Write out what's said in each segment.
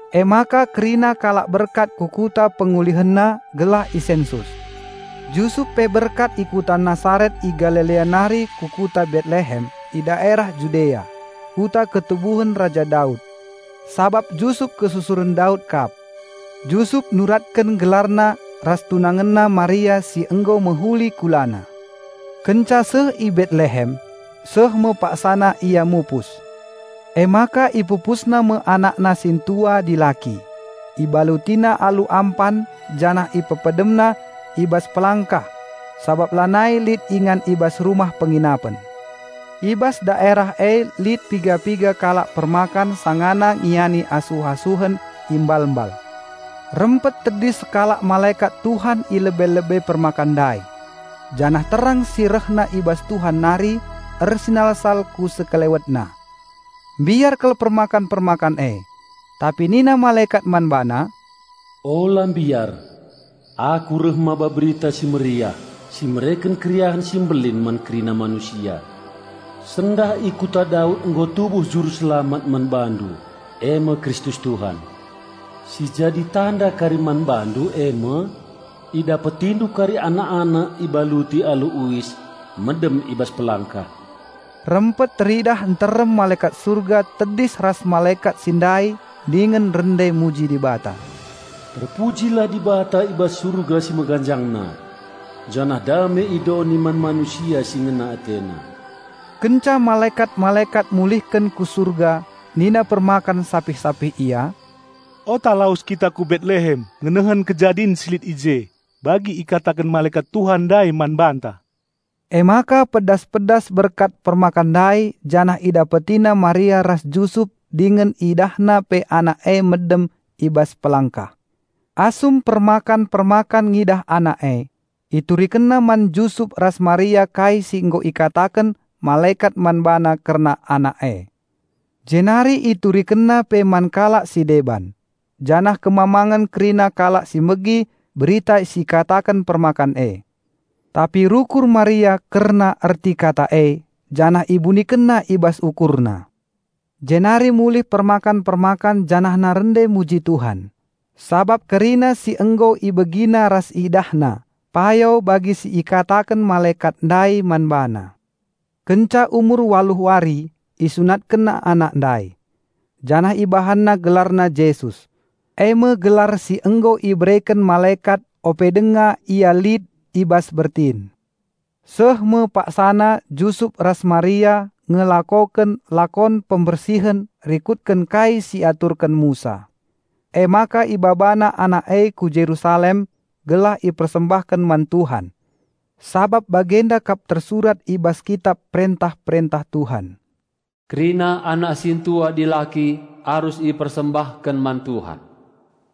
Emaka kerina kalak berkat ku kuta pengulihenna gelah isensus. Jusup pe berkat i kuta Nasaret i Galilea nari ku kuta Betlehem i daerah Judea, kuta ketubuhen Raja Daud; sabab Jusup kesusuren Daud kap. Jusup nuratken gelarna ras tunangenna Maria si nggo mehuli kulana. Kenca seh i Betlehem, seh me paksana ia mupus. Emaka ipupusna me anakna sintua dilaki, ibalutina alu ampan janah ipepedemna i bas pelangkah sabap lanai lit ingan i bas rumah penginapen. I bas daerah e lit piga-piga kalak permakan sangana ngingani asuh-asuhen i mbal-mbal. Rempet tedis sekalak malekat Tuhan ilebe-lebe permakan ndai, janah terang si rehna i bas Tuhan nari ersinalsal ku sekelewetna. Mbiar kal permakan-permakan e, tapi nina malekat man bana, "Ola mbiar: Aku reh maba Berita Si Mehuli, si mereken keriahen si mbelin man kerina manusia. Sendah i Kota Daud nggo tubuh Raja Penampatndu e me Kristus Tuhan. Si jadi tanda kari man bandu e me: idapetindu kari anak-anak ibaluti alu uis, medem i bas pelangkah." Rempet teridah nterem malekat Surga tedis ras malekat si ndai dingen rende muji Dibata, "Terpujilah Dibata i bas Surga si meganjangna. Janah dame i doni man manusia si ngena AteNa." Kenca malekat-malekat mulihken ku surga nina permakan sapih-sapih ia, "Ota lawes kita ku Betlehem ngenehen kejadin si lit i je, bagi ikatakan malekat tuhan ndai man banta." Emaka pedas-pedas berkat permakan ndai janah idapetina Maria ras Jusup dingen idahna pe Anak e medem i bas pelangkah. Asum permakan-permakan ngidah Anak e, iturikenna man Jusup ras Maria kai si nggo ikataken malekat man bana kerna Anak e. Jenari iturikenna pe man kalak si deban, janah kemamangen kerina kalak si megi berita si ikataken permakan e. Tapi rukur Maria kerna erti kata e janah ibunikenna i bas ukurna. Jenari mulih permakan-permakan janahna rende muji Tuhan, sabap kerina si nggo ibegina ras idahna payo bagi si ikataken malekat ndai man bana. Kenca umur waluh wari isunatkenna Anak ndai. Janah ibahanna GelarNa Jesus, eme gelar si nggo ibereken malekat ope denga Ia lit i bas bertin. Seh me paksana Jusup ras Maria ngelakoken lakon pembersihen rikutken kai si iaturken Musa. Emaka ibabana Anak e ku Jerusalem gelah ipersembahken man Tuhan. Sabap bagenda kap tersurat i bas kitap perentah-perentah Tuhan, "Kerina anak sintua dilaki arus ipersembahken man Tuhan."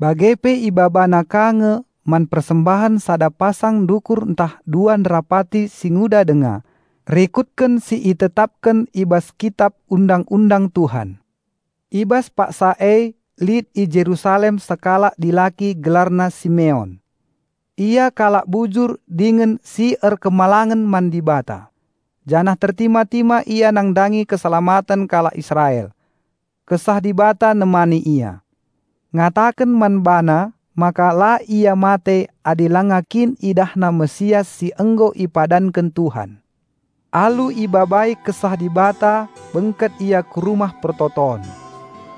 Bage pe ibabana ka nge man persembahen sada pasang ndukur ntah dua nderapati si nguda denga, rikutken si itetapken i bas kitap undang-undang Tuhan. I bas paksa e lit i Jerusalem sekalak dilaki gelarna Simeon. Ia kalak bujur dingen si erkemalangen man Dibata, janah tertima-tima ia nandangi Keselamaten kalak Israel. Kesah Dibata nemani ia, ngataken man bana maka la ia mate adi lenga kin idahna Raja Penampat si nggo ipadanken Tuhan. Alu ibabai Kesah Dibata bengket ia ku Rumah Pertoton.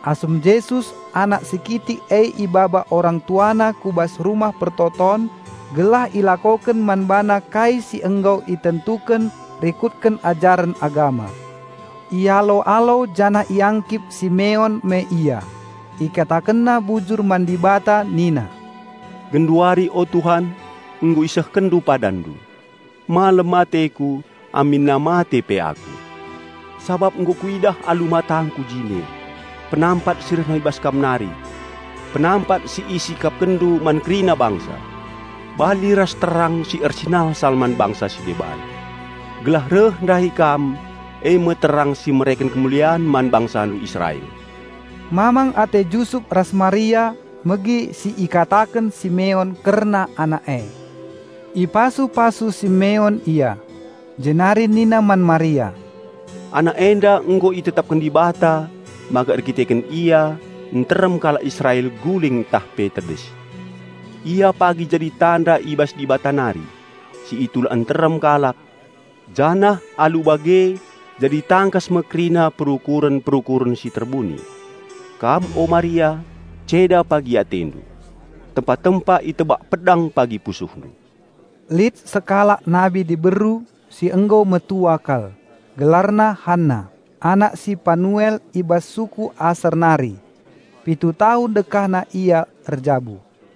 Asum Jesus, anak si kitik e ibaba orang TuaNa ku bas Rumah Pertoton gelah ilakoken man bana kai si nggo itentuken rikutken ajaren agama, ialo-alo janah iangkip Simeon me Ia, ikatakenna bujur man Dibata nina, "Genduari o Tuhan, nggo IsehkenNdu PadanNdu. Malem ateku aminna mate pe aku. Sabap nggo kuidah alu matangku jine, penampat si rehna i bas Kam nari. Penampat si IsikapkenNdu man kerina bangsa, bali ras terang si ersinalsal man bangsa si deban, gelah reh ndahi Kam e me terang si mereken kemulian man BangsaNdu Israel." Mamang ate Jusup ras Maria megi si ikataken Simeon kerna Anak e. Ipasu-pasu Simeon ia, jenari nina man Maria, "Anak enda nggo itetapken Dibata maka erkiteken Ia nterem kalak Israel guling tah pe tedis. Ia pagi jadi tanda i bas Dibata nari, si itulak nterem kalak, janah alu bage jadi tangkas me kerina perukuren-perukuren si terbuni. Kam o Maria, ceda pagi atendu. Tempa-tempa itebak pedang pagi pusuhndu." Lit sekalak nabi diberu si nggo metua kal. Gelarna Anna, anak si Panuel i bas suku Aser nari. Pitu tahun dekahna ia erjabu.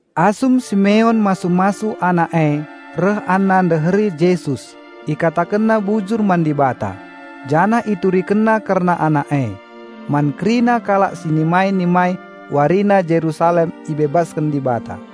Asum Simeon masu-masu Anak e reh Anna ndeheri Jesus ikatakenna bujur man Dibata, janah iturikenna kerna Anak e, man kerina kalak si nimai-nimai warina Jerusalem ibebasken Dibata.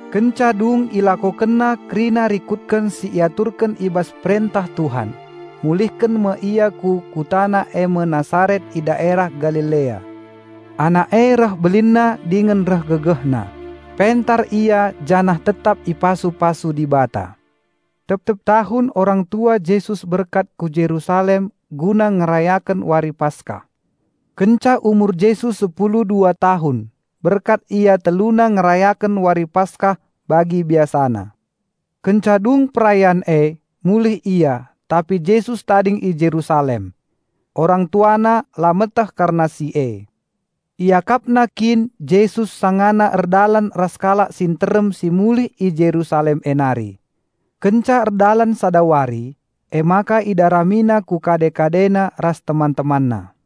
Kenca dung ilakokenna kerina rikutken si iaturken i bas perentah Tuhan, mulihken me ia ku kutana e me Nasaret i daerah Galilea. Anak e reh belinna dingen reh gegehna; pentar Ia janah tetap ipasu-pasu Dibata. Tep-tep tahun orang tua Jesus berkat ku Jerusalem guna ngerayaken Wari Paskah. Kenca umur Jesus sepulu dua tahun, berkat Ia teluna ngerayaken Wari Paskah bagi biasana. Kenca dung perayan e, mulih ia, tapi Jesus tading i Jerusalem. Orang tuana la meteh kerna si e. Iakapna kin Jesus sangana erdalan ras kalak si nterem si mulih i Jerusalem e nari. Kenca erdalan sada wari emaka idaramina ku kade-kadena ras teman-temanna.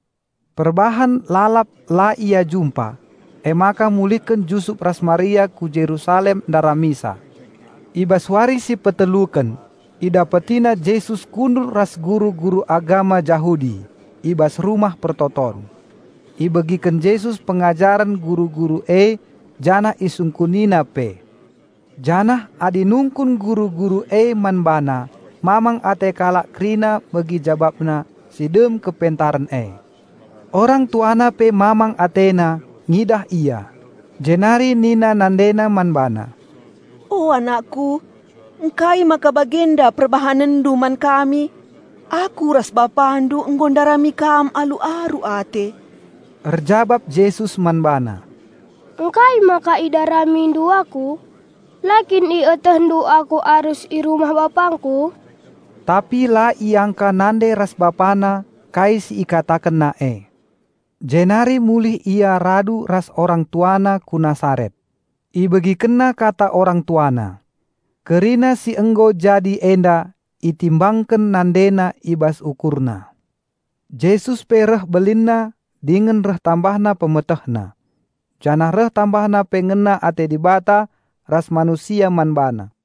Perbahan lalap la ia jumpa, emaka mulihken Jusup ras Maria ku Jerusalem ndaramisa. I bas wari si peteluken idapetina Jesus kundul ras guru-guru agama Jahudi i bas Rumah Pertoton. Ibegiken Jesus pengajaren guru-guru e janah IsungkuniNa pe. Janah adi nungkun guru-guru e man BaNa mamang ate kalak kerina megi JabapNa si dem kepentaren e. Orang tuana pe mamang atena ngidah Ia, jenari nina NandeNa man BaNa, "O Anakku, ngkai maka bagenda PerbahanenNdu man kami? Aku ras bapandu nggo ndarami Kam alu aru ate." Erjabap Jesus man bana, "Ngkai maka idaramindu Aku? La kin ietehndu Aku arus i rumah BapangKu?" Tapi la iangka nande ras BapaNa kai si IkatakenNa e. Jenari mulih Ia radu ras orang TuaNa ku Nasaret; IbegikenNa kata orang TuaNa. Kerina si nggo jadi enda itimbangken NandeNa i bas ukurna. Jesus pe reh belinna dingen reh tambahna PemetehNa, janah reh tambahna pe ngena ate Dibata ras manusia man BaNa.